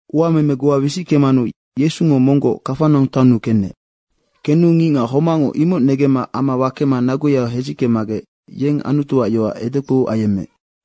Uameme goa wisickemanu Yesungo monggoc Kafanaung taonnu kenec. Kenu ngicngac homacngo imoc negemma ama wakema naguya hedzickemagec yeng Anutuac yoac edekpou ayemmeec.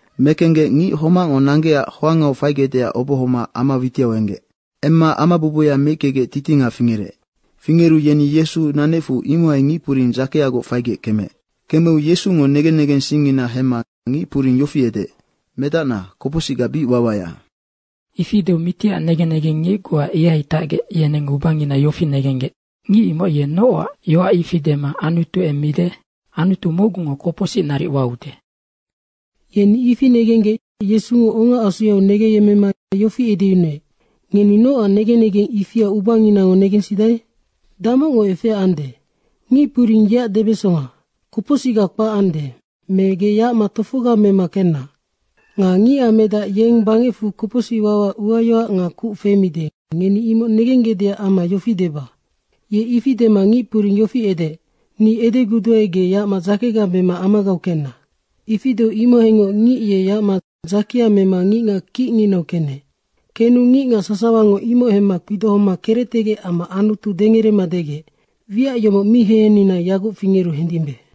Mekenggec ngic homacngo nanggecac hoangau faigecdeac obohoma ama witiau enggec. Emma ama bubuya meickegec titinga fingerec. Fingeru yeni Yesu nanecfu imohai ngicpuring dzakeagoc faigec kemeec. Kemeu Yesungo negen negensingngina hemma ngicpuring yofi edeec, “Medacna, kopocsicga bic wawaya.” Ifi deu mitiac negen negengngic goa ihai tacgec, yeneng ubanginau yofi negenggec. “Ngic imoc ye nocac yoac ifi dema Anutu emmide! Anutu mocgungo kopocsic naric waude.” Yeni ifi negenggec Yesungo ongaasuyau negengyemmema yofi edeyunuec, “Ngeni nocac negen negeng ifia ubanginango negensidae? Damocngo efea ande? Ngic puring yeac debesonga, ‘Kopocsicga kpac ande’, me ‘Ge yacma tofoga mema kenna.’ Nga Ngicac Medac, yeng bangecfu kopocsic wawaac uayoac nga kuc femide, ngeni imoc negenggecdeac amma yofi deba.” Ye ifi dema ngicpuring yofi edeec, “Ni edeguduae, ge yacma dzakega mema amagau kenna.” Ifi deu imohaingoc ngic ye yacma dzakea mema ngicngac kicnginau kenec. Kenu ngicngac sasawango imoc hemma kpidohoma kerectegec amma Anutu dengerema degec, “Wiac yomoc mi hehennina yaguc fingeru hendimbe.”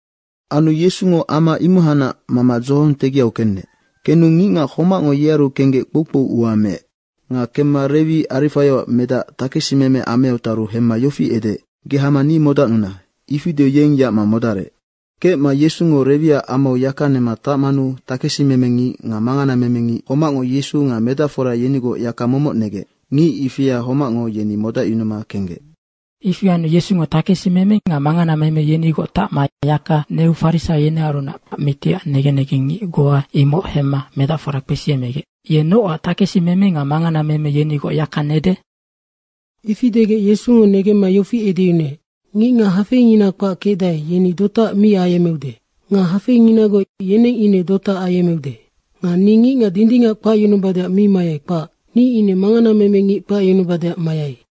Anu Yesungo ama imohanac mama dzohong tegiau kenec. Kenu ngicngac homacngo yearu kenggec kpoukpou ua meec. Nga kemma Rewi Arifaioac medac takesimeme ameau taru hemma yofi edeec, “Ge hama ni modacnuna!” Ifi deu yeng yacma modarec. Kecma Yesungo Rewiac amau yaka nema tacmanu takesimeme ngic nga manganameme ngic homacngo Yesu nga medacfora yenigoc yaka momoc negec. Ngic ifia homacngo yeni modacyunuma kenggec. Ifi anu Yesungo takesimeme nga manganameme yenigoc tacma yaka neu farisaio yenearunac mitiac negen negengngic goa, yeneng imoc hemma medacfora kpesiyemmegec, “Ye nocac takesimeme nga manganameme yenigoc yaka nede?” Ifi degec Yesungo negemma yofi edeyunuec, “Ngicngac hafeingina kpac kecdae, yeni dotaac mi ayemmeude. Nga hafeinginagoc, yeneng ine dotaac ayemmeude. Nga ni ngicngac dindingac kpacyunubadeac mi mayai, kpac. Ni ine manganameme ngic kpacyunubadeac mayai.”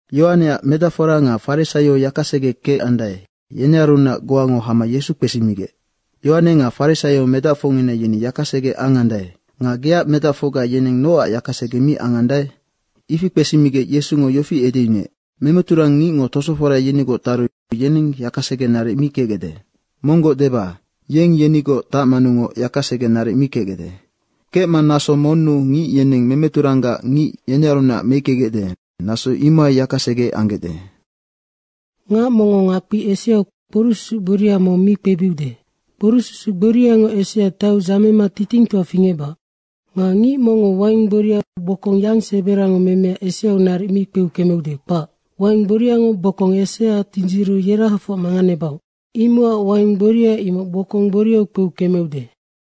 Yohaneac medacfora nga farisaio yakasege kecandae, yenearunac goango hama Yesu kpesimigec, “Yohane nga farisaio medacfocngina yeni yakasege angandae. Nga geac medacfocga yeneng nocac yaka sege mi angandae?” Ifi kpesigec Yesungo yofi edeyunuec, “Memeturang ngicngo tosofora yenigoc taru yeneng yakasege naric mi kecgecde. Monggoc deba, yeng yenigoc tacmanungoc yakasege naric mi kecgecde. Kecma naso monnu ngic yeneng memeturanggac ngic yenearunac meickegecde, naso imohai yakasege anggecde. Ngac mongngo ngakpi eseau kporucsusuc gboria mong mi kpebiude. Kporucsusu gboriango esea taiu dzamema titingtoa fingecbac. Nga ngic mongngo waing gboria bokong yang seberango memea eseau naric mi kpeu kemeude, kpac. Waing gboriango bokong esea tindziru yerahafoc manganebaoc. Imocac waing gboria imoc bokong gboriau kpeu kemeude.”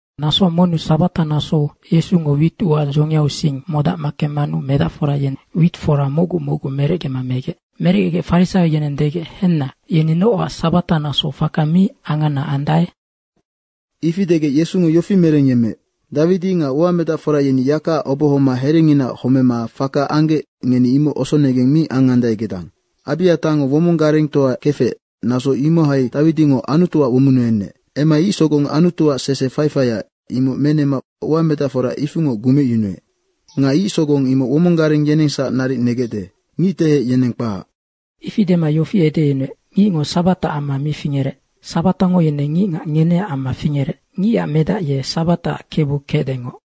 Naso monnu sabata nasou Yesungo wit ua dzongiau sing modac kemmanu medacfora yeneng wit fora mocgu mocgu merecgema megec. Merecgegec farisaio yeneng degec, “Henna, yeni nocac sabata nasou faka mi angana andae?” Ifi degec Yesungo yofi merengyemmeec, “Dawidi nga uamedacfora yeni yakaac obohoma herenginaac homema faka anggec, ngeni imoc osonegeng mi angandae gedang. Abiatango womong garengtoa kefec, naso imohai Dawidingo Anutuac womonnu enec. Emma ic sogong Anutuac sese faifaia, imoc menema uamedacfora ifingoc gumecyunuec. Nga ic sogong imoc womong gareng yenengsac naric negecde, ngictehec yeneng kpac.” Ifi dema yofi edeyunuec, “Ngicngo sabataac amma mi fingerec, sabatango ine ngicngac ngeneac amma fingerec. Ngicac Medac ye sabataac Kebu kecdengoc.”